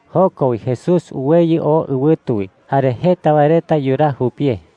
Joko wi Jesús uweyɨ oo ɨwɨtu wi, jare jeta wae reta yuraa jupie.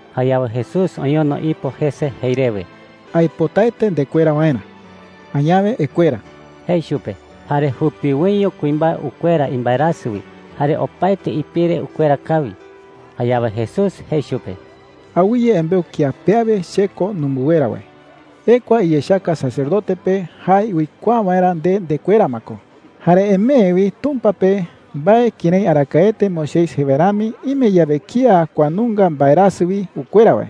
Jayawe Jesús oñono ipo jese jei rewe: “Aipotaete ndekuera waerä. Añawe ekuera,” jei chupe. Jare jupiwoiño kuimbae ukuera imbaerasɨ wi jare opaete ipire ukuera kawi. Jayawe Jesús jei chupe: “Awɨye embeu kía pe awe che ko numɨnguera wae,” jei. “Ekua iyechaka sacerdote pe jae uikuaa waerä nde ndekuera ma ko. Jare emee wi Tumpa pe mbae kërái arakaete Moisés jei wae rami, ime yawe kía kua nunga mbaerasɨ wi ukuera wae.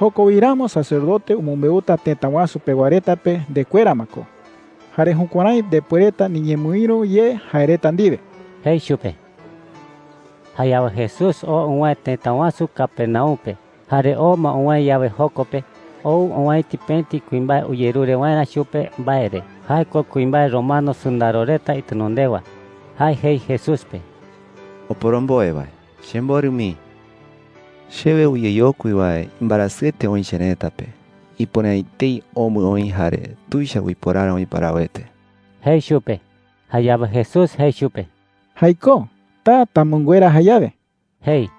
Joko wi ramo sacerdote umɨmbeuta tëta wasu pewa reta pe ndekuera ma ko, jare jukuärái ndepuereta niñemɨïru ye jae reta ndiwe,” jei chupe. Jayawe Jesús oo uwäe tëta wasu Capernaum pe. Jare oo ma uwäe yawe joko pe, ou owäiti pëti kuimbae uyerure waerä chupe mbae re. Jae ko kuimbae romano sɨndaro reta itenondewa. Jae jei Jesús pe: “Oporomboe wae, chemborɨ mii,” jei. “Chewe uyeyokui wae imbaerasɨete oï cherëta pe. Ipuere’ä etei omɨ oï jare tuicha uiporara oï parawete,” jei chupe. Jayawe Jesús jei chupe: “Jaikó. Taa tamɨnguera jayawe,” jei.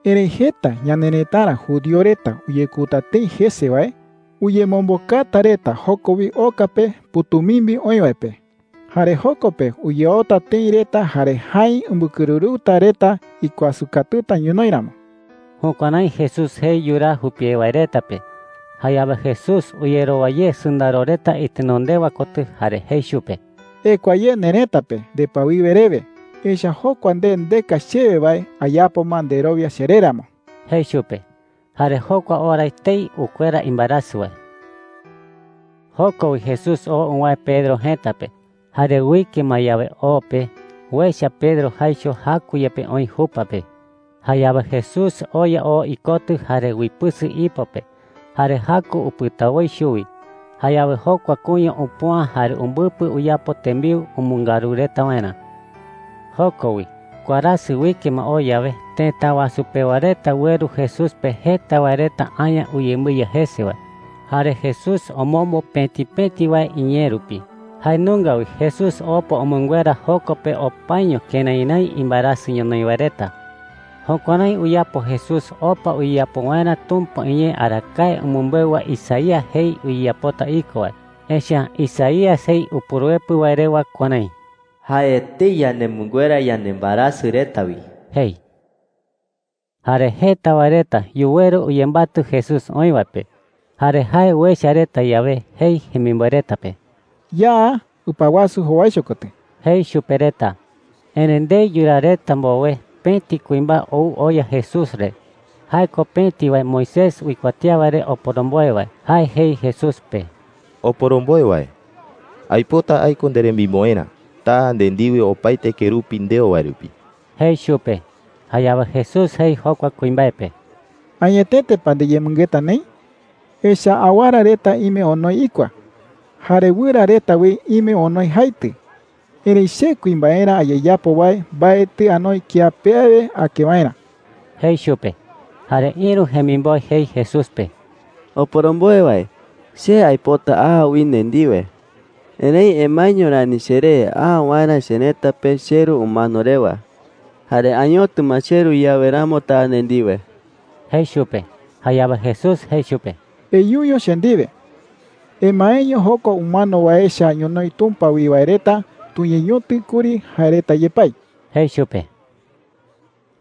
“Erëi jeta ñanerëtara judío reta uyekouta tëi jese wae, uyemombokata reta joko wi oka pe pɨ̈tumimbi oï wae pe. Jare joko pe uyaota tëi reta jare jäi umbɨkɨrɨrɨuta reta ikuasɨ katuta ñonoï ramo.” Jukuärái Jesús jei yuraa jupie wae reta pe. Jayawe Jesús uyerowa ye sɨndaro reta itenondewa kotɨ jare jei chupe: “Ekua ye nerëta pe ndepɨawiwe rewe, echa’ä jokua nde ndeka chewe wae ayapo ma nderowia cheré ramo,” jei chupe. Jare jokua ora etei ukuera imbaerasɨ wae. Joko wi Jesús oo uwäe Pedro jëta pe. Jare uike ma yawe o pe, uecha Pedro jaicho jaku yepe oï jupa pe. Jayawe Jesús oya oo ikotɨ jare uipɨsɨ ipo pe, jare jaku upɨta woi chuwi. Jayawe jokua kuña upüa jare umbɨpɨ uyapo tembiu umɨngaru reta waerä. Joko wi, warasɨ uike ma oo yawe, tëta wasu pewa reta ueru Jesús pe jeta wae reta aña uyembɨiya jese wae. Jare Jesús omombo pëti pëti wae iñee rupi. Jae nunga wi Jesús opa umɨnguera joko pe opaño kërái rái imbaerasɨ ñonoï wae reta. Jukuärái uyapo Jesús opa uyeyapo waerä Tumpa iñee arakae umɨmbeu wae Isaías jei uyeyapota iko wae. Echa’ä Isaías jei Upuruepɨ wae rewa kuärái: “Jae etei yanemɨnguera yanembaerasɨ reta wi,” jei. Jare jeta wae reta yuweru uyembatɨ Jesús oï wae pe. Jare jae uecha reta yawe, jei jemimboe reta pe: “Ya ɨpa wasu jowaicho kotɨ,” jei chupe reta. Erëi ndei yuraa reta mbowe, pëti kuimbae ou oya Jesús re. Jae ko pëti wae Moisés uikuatía wae re oporomboe wae. Jae jei Jesús pe: “Oporomboe wae,” jei chupe. “Aipota aiko nderemimboerä. Taa nde ndiwe opaete kerupi ndeo wae rupi,” jei chupe. Jayawe Jesús jei jokua kuimbae pe: “¿Añetete pa ndiyemɨngeta neï? Echa’ä awara reta ime onoi ikua, jare wɨra reta wi ime onoi jaitɨ. Erëi che kuimbaerä ayeyapo wae mbaetɨ anoi kiape awe ake waerä,” jei chupe. Jare ïru jemimboe jei Jesús pe: “Oporomboe wae, che aipota a wi nde ndiwe,” jei chupe. “Erëi emaeño rani cheré a waerä cherëta pe cheru umano rewa. Jare añotɨ ma cheru yawe ramo taa nde ndiwe,” jei chupe. Jayawe Jesús jei chupe: “Eyuño che ndiwe. Emaeño jokua umano wae echa ñonoï Tumpa wi wae reta tuñeñotɨ kuri jae reta yepái,” jei chupe.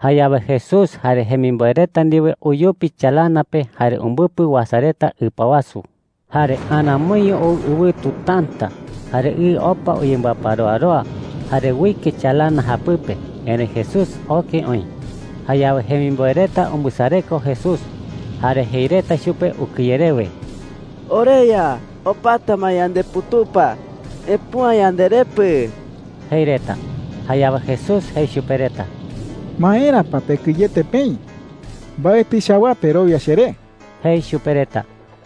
Jayawe Jesús jare jemimboe reta ndiwe uyupi chalana pe jare umbɨpɨ uasa reta ɨpa wasu. Jare aramoiño ou ɨwɨtu täta, jare ɨ opa uyembɨaparoaroa jare uike chalana japɨpe. Erëi Jesús oke oï. Jayawe jemimboe reta umbɨsareko Jesús, jare jei reta chupe ukɨye rewe: “¡OreYa, opata ma yandeputupa! ¡Epüa yanderepɨ!” jei reta. Jayawe Jesús jei chupe reta: “¿Maera pa pekɨyete peï? Mbaetɨ chawaa perowia cheré,” jei chupe reta.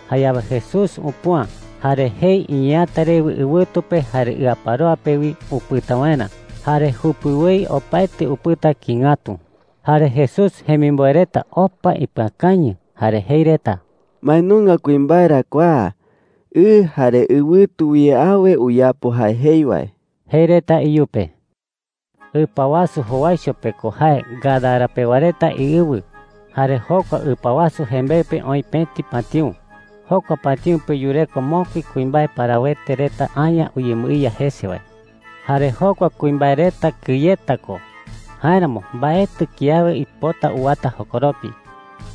Jayawe Jesús upüa, jare jei iñeeäta rewe ɨwɨtu pe jare ɨaparoa pe wi upɨta waerä. Jare jupiwoi opaete upɨta kïi ngatu. Jare Jesús jemimboe reta opa ipɨakañɨ jare jei reta: “¿Mbae nunga kuimbae ra kua? Ɨ jare ɨwɨtu wi awe uyapo jae jei wae,” jei reta iyupe. Ɨpa wasu jowaicho pe ko jae Gadara pewa reta iɨwɨ. Jare jokua ɨpa wasu jembeɨ pe oï pëti patïu. Jokua patïu pe yureko mokui kuimbae parawete reta aña uyembɨiya jese wae. Jare jokua kuimbae reta kɨyeta ko. Jáeramo mbaetɨ kiawe uipota uwata jokoropi.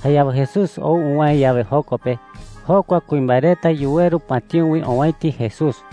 Jayawe Jesús ou uwäe yawe joko pe, jokua kuimbae reta yuweru patïu wi owäiti Jesús.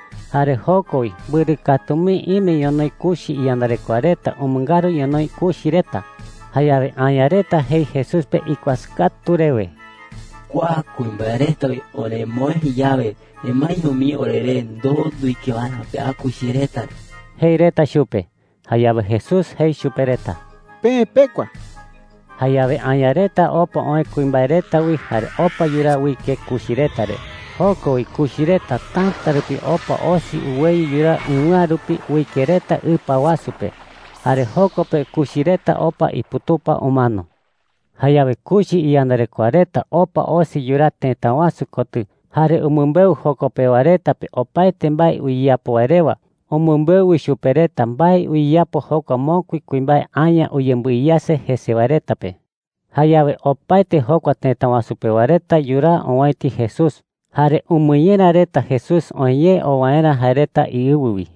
Jare joko wi mbɨrɨ katu mii ime ñonoï kuchi iyandarekoa reta umɨngaru ñonoï kuchi reta. Jayawe aña reta jei Jesús pe ikuasɨ katu rewe: “Kua kuimbae reta wi oremoë yawe, emaeño mii oreré ndoo nduike waerä pea kuchi reta re,” jei reta chupe. Jayawe Jesús jei chupe reta: “Peë pekua.” Jayawe aña reta opa oë kuimbae reta wi jare opa yuraa uike kuchi reta re. Joko wi kuchi reta täta rupi opa osi uweyɨ yuraa ɨwɨ̈a rupi uike reta ɨpa wasu pe. Jare joko pe kuchi reta opa iputupa umano. Jayawe kuchi iyandarekoa reta opa osi yuraa tëta wasu kotɨ jare umɨmbeu joko pewa reta pe opaete mbae uyeyapo wae rewa. Umɨmbeu wi chupe reta mbae uyeyapo jokua mokui kuimbae aña uyembɨiyase jese wae reta pe. Jayawe opaete jokua tëta wasu pewa reta yuraa owäiti Jesús. Jare umɨñera reta Jesús oë ye oo waerä jae reta iɨwɨ wi.